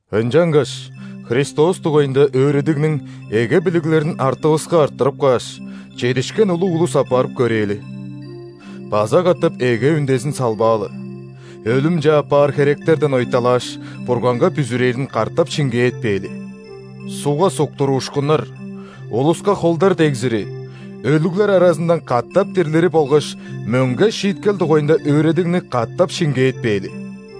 Ынчангаш Христос дугайында өөредигниң эге билиглерин артывыска арттырып кааш, чедишкен улуг улус апарып көрээли. База катап эге үндезин салбаалы: өлүмче аппаар херектерден ойталааш, Бурганга бүзүрээрин катап шиңгээтпээли; ·сугга суктуруушкуннар, улуска холдар дегзири, өлүглер аразындан катап дирлири болгаш мөңге шииткел дугайында өөредигни катап шиңгээтпээли.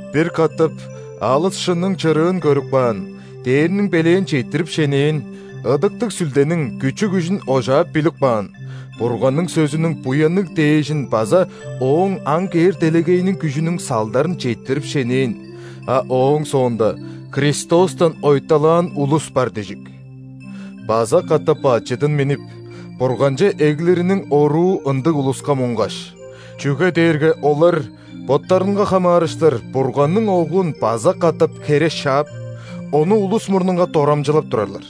Бир катап алыс шынның чырыын көрүп каан, дээрниң белээн четтирип шенээн, Ыдыктыг Сүлдениң күчү-күжүн ожаап билип каан, Бурганның сөзүнүң буянныг дээжин база Ооң ам кээр делегейиниң күжүнүң салдарын четтирип шенээн, а ооң соонда Христостан ойталаан улус бар дижик. База катап бачыдын миннип, Бурганче эглириниң оруу ындыг улуска муңгаш, чүге дээрге олар боттарынга хамаарыштыр Бурганның Оглун база катап хере шаап, Ону улус мурнунга дорамчылап турарлар.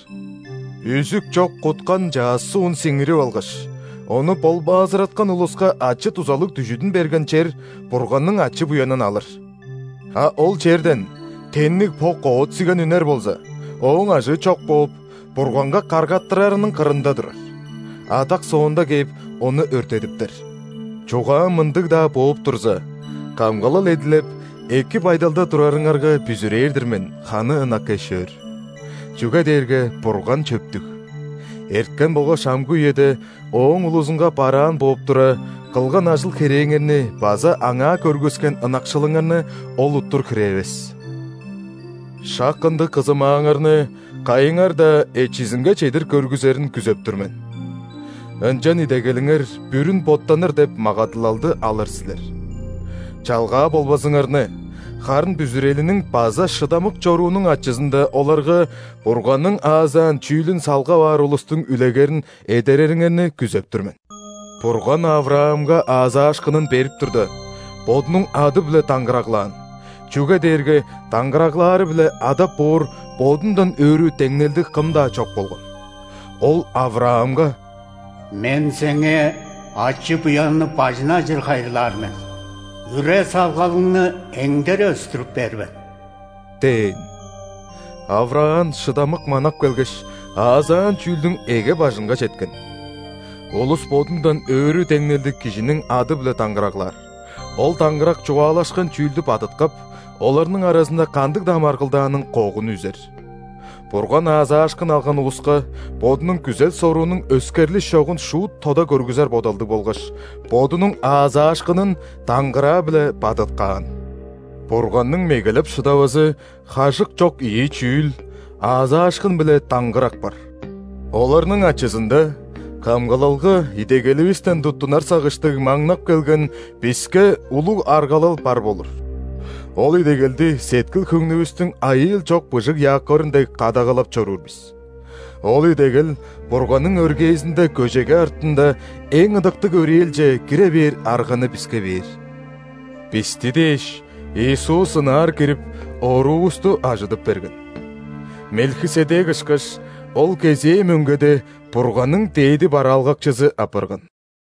Үзүк чок куткан чаъс суун сиңирип алгаш, ону болбаазыраткан улуска ачы-дузалыг дүжүдүн берген чер Бурганның ачы-буянын алыр. А ол черден тенниг бок оът-сиген үнер болза, ооң ажыы чок бооп, Бурганга каргаттырарының кырында турар. Адак соонда кээп, ону өрттедиптер. Чугаам мындыг-даа бооп турза, камгалал эдилеп, эки байдалда турарыңарга бүзүрээр-дир мен, ханы ынак эш-өөр. Чүге дээрге Бурган чөптүг. Эрткен болгаш амгы үеде Ооң улузунга бараан бооп тура, кылган ажыл-херээңерни база Аңаа көргүскен ынакшылыңарны Ол уттур хире эвес. Шак ындыг кызымааңарны кайыңар-даа эчизинге чедир көргүзерин күзеп тур мен. Ынчан идегелиңер бүрүн боттаныр деп магадылалды алыр силер. Чалгаа болбазыңарны, харын бүзүрелиниң база шыдамык чоруунуң ачызында оларга Бурганның аазаан чүүлүн салгап аар улустуң үлегерин эдерериңерни күзеп тур мен. Бурган ·Авраамга аазаашкынын берип турда, Бодунуң ады-биле даңгыраглаан, чүге дээрге даңгыраглаары-биле адап боор Бодундан өрү деңнелдиг кым-даа чок болган. Ол Авраамга:«Мен сеңээ ачы-буянны бажын ажыр хайырлаар мен,үре-салгалыңны эңдере өстүрүп бээр мен» – дээн. Авраам шыдамык манап келгеш, аазаан чүүлдүң эге-бажынга четкен. Улус бодундан өрү деңнелдиг кижиниң ады-биле даңгыраглаар, ол даңгырак чугаалашкан чүүлдү бадыткап, оларның аразында кандыг-даа маргылдааның когун үзер. Бурган аазаашкын алган улуска Бодунуң күзел-соруунуң өскерлиш чогун шуут тода көргүзер бодалдыг болгаш, Бодунуң аазаашкынын даңгыраа-биле бадыткаан. Бурганның мегелеп шыдавазы хажык чок ийи чүүл: аазаашкын биле даңгырак бар. Оларның ачызында камгалалга идегеливистен туттунар сагыштыг маңнап келген биске улуг аргалал бар болур. Ол идегелди сеткил-хөңнүвүстүң айыыл чок быжыг якорун дег кадагалап чоруур бис. Ол идегел Бурганның өргээзинде көжеге артында Эң ыдыктыг өрээлче кире бээр арганы биске бээр. Бисти дээш, Иисус ынаар кирип, оруувусту ажыдып берген. Мелхиседек ышкаш, Ол кезээ мөңгеде Бурганның дээди бараалгакчызы апарган.